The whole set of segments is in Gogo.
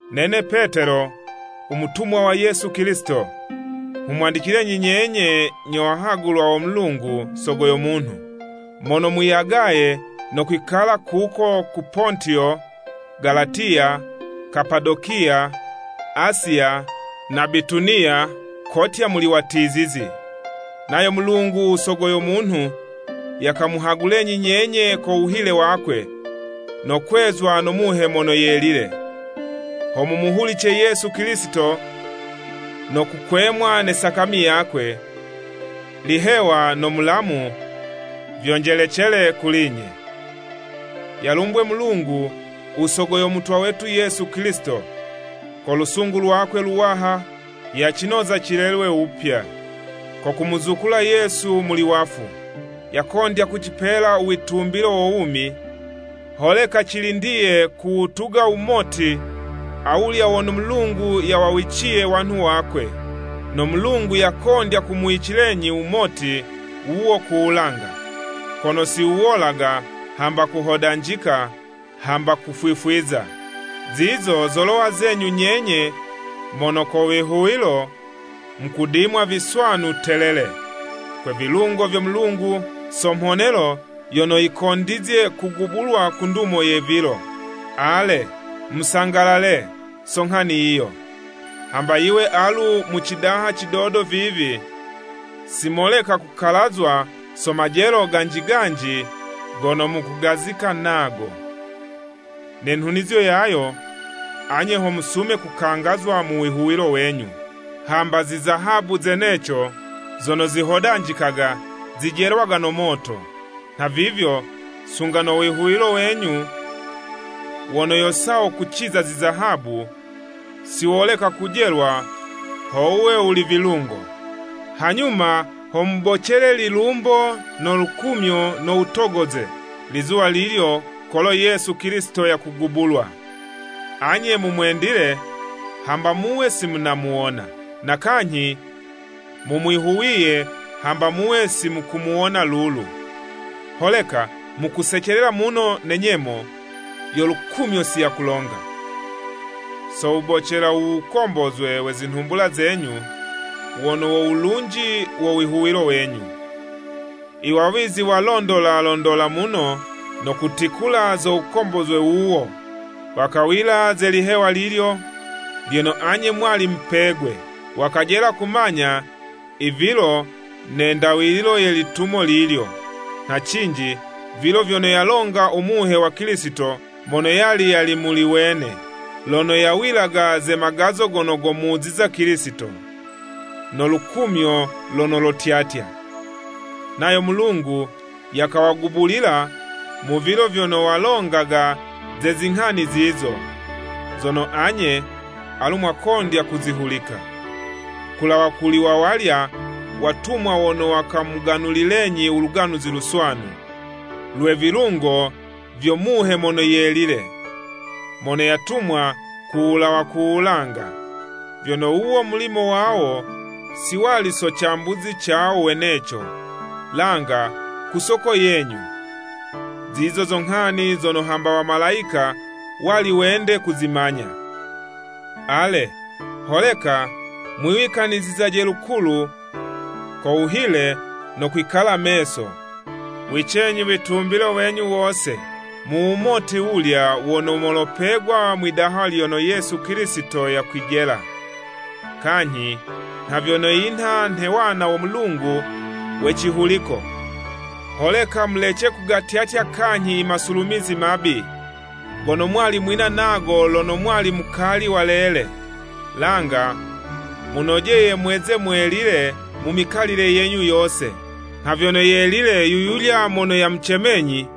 Nene Petelo, umutumwa wa Yesu Kilisito. Nghumwandicilenyi nyenye nyo wahagulwa wo Mulungu Sogo yo munhu, mono mwiyagaye no kwikala kuko ku Pontiyo, Galatiya, Kapadokiya, Asiya na Bituniya kotya muli watizizi. Nayo Mulungu u Sogo yo munhu yakamuhagulenyi nyenye ko wuhile wakwe, no kwezwa no Muhe Mono Yelile, ho mumuhulice Yesu Kilisito no kukwemwa ne sakami yakwe. Lihewa no mulamu vyonjelecele kuli'nye. Yalumbwe Mulungu, u Sogo yo Mutwa wetu Yesu Kilisito! Ko lusungu lwakwe luwaha, yacinoza cilelwe wupya, ko kumuzukula Yesu muli wafu. Yakondya kucipela u witumbilo wo wumi, holeka cilindiye kuwutuga wumoti awulya wono Mulungu yawawiciye wanhu wakwe. No Mulungu yakondya kumuwicilenyi wumoti wuwo ku wulanga, kono siwuwolaga, hamba kuhodanjika, hamba kufwifwiza. Zizo zolowa zenyu nyenye mono ko wihuwilo, mukudimwa viswanu telele, kwe vilungo vyo Mulungu, so mhonelo yono yikondizye kugubulwa ku ndumo ye vilo. Ale, musangalale, so nghani yiyo, hambe yiwe alu mu cidaha cidodo vivi, simoleka kukalazwa so majelo ganji ganji gono mukugazika ngo. Ne nhunizo yayo, anye ho musume kukangazwa mu wihuwilo wenyu. Hambe zizahabu zeneco, zono zihodanjikaga, zijelwaga no moto, nhavivyo sunga no wihuwilo wenyu, wono yo sawo kuciza zizahabu, siwoleka kujelwa ho wuwe wuli vilungo. Hanyuma ho mubocele lilumbo no lukumyo no wutogoze, lizuwa lilyo kolo Yesu Kilisito yakugubulwa. Anye mumwendile, hamba muwe simunamuwona, na kanyhi mumwihuwiye hamba muwe simukumuwona lulu. Holeka, mukusecelela muno ne nyemo yo lukumyo siyakulonga. So wubocela uwukombozwe we zinhumbula zenyu, wono wo wulunji wo wihuwilo wenyu. Iwawizi walondola londola muno, no kutikula zo wukombozwe wuwo, wakawila ze lihewa lilyo, lyono anye mwali mupegwe. Wakajela kumanya ivilo ne ndawililo ye litumo lilyo, nha cinji vilo vyono yalonga u Muhe wa Kilisito mono yali yali muli wene, lono yawilaga ze magazo gono gomuziza Kilisito, no lukumyo lono lotyatya. Nayo Mulungu yakawagubulila mu vilo vyono walongaga ze zinghani zizo, zono anye, alu mwakondya kuzihulika, kulawa kuli wawalya watumwa wono wakamuganulilenyi u Luganuzi Luswanu, lwe vilungo vyo Muhe Mono Yelile, mono yatumwa ku wulawa ku wulanga, vyono wuwo mulimo wawo, si wali so cambuzi cawo weneco, langa ku soko yenyu. Zizo zo nghani zono hamba wamalayika wali wende kuzimanya. Ale, holeka mwiwikanizizaje lukulu ko wuhile no kwikala meso. Wicenyi witumbilo wenyu wose mu wumoti wulya wono molopegwa mwi'daha lono Yesu Kilisito yakwijela! Kanyhi nha vyono yinha nhe wana wo Mulungu we cihuliko, holeka mulece kugatyatya kanyhi imasulumizi mabi, gono mwali mwina nago lono mwali mukali walele. Langa munojeye mweze mwelile mu mikalile yenyu yose, nha vyono yelile yu yulya mono yamucemenyi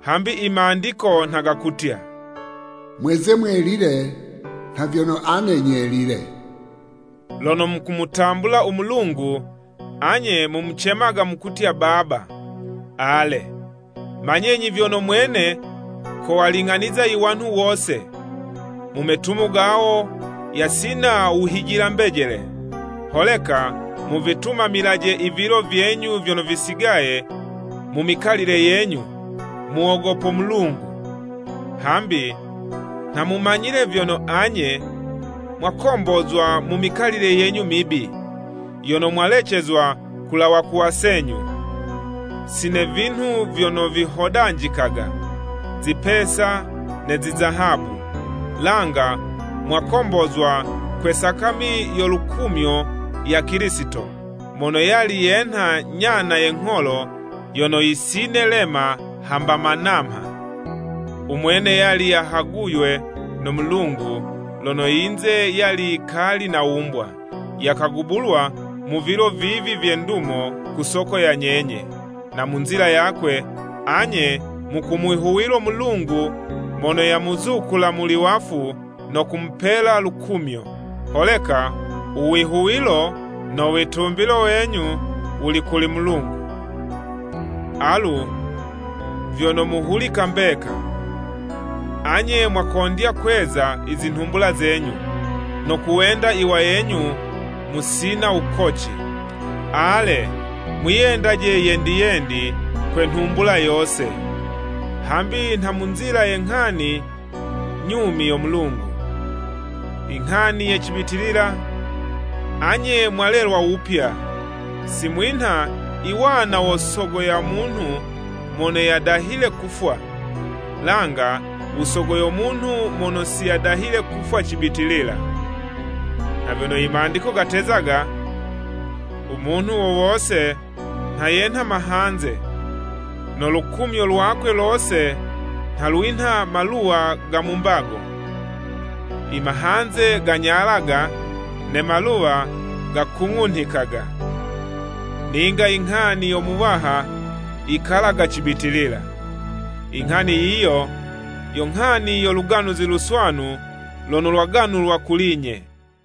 Hambi i Mandiko nha gakutya, “Mweze mwelile, nha vyono ane nyelile.” Lono mukumutambula u Mulungu, anye Mumucemaga mukutya Baba. Ale, manyenyi vyono mwene kowaling'aniza i wanhu wose mu metumo gawo yasina wuhijila-mbejele. Holeka muvitumamilaje ivilo vyenyu vyono visigaye mu mikalile yenyu, mu wogopo Mulungu. Hambi nha mumanyile vyono, anye mwakombozwa mu mikalile yenyu mibi, yono mwalecezwa kulawa ku wasenyu, si ne vinhu vyono vihodanjikaga, zipesa ne zizahabu, langa mwakombozwa kwe sakami yo lukumyo ya Kilisito, mono yali yenha nyana ye ngholo yono yisine'lema hamba ma namha. Umwene yali yahaguywe no Mulungu lono yinze yali yikali nawumbwa, yakagubulwa mu vilo vivi vye ndumo ku soko ya nyenye. Na mu nzila yakwe, anye mukumwihuwilo Mulungu mono yamuzukula muli wafu no kumupela lukumyo, holeka uwihuwilo no witumbilo wenyu wuli kuli Mulungu. Alu vyono mu wuhulika mbeka, anye mwakondya kweza i zinhumbula zenyu, no kuwenda iwayenyu musina wukoci, ale, mwiyendaje yendi yendi kwe nhumbula yose. Hambi nha mu nzila ye nghani nyumi yo Mulungu, inghani ye cibitilila, anye mwalelwa wupya, si mwinha i wana wo sogo ya munhu mono yadahile kufwa, langa usogo yo munhu mono siyadahile kufwa cibitilila. Nha vyono i Mandiko gatezaga: “U munhu wo wose nha yenha mahanze no lukumyo lwakwe lose nha lwinha maluwa ga mu mbago. Imahanze ganyalaga ne maluwa gakung'unhikaga. Ninga inghani yo Muwaha yikalaga cibitilila.” Inghani yiyo, yo nghani yo Luganuzi Luswanu lono lwaganulwa kuli'nye.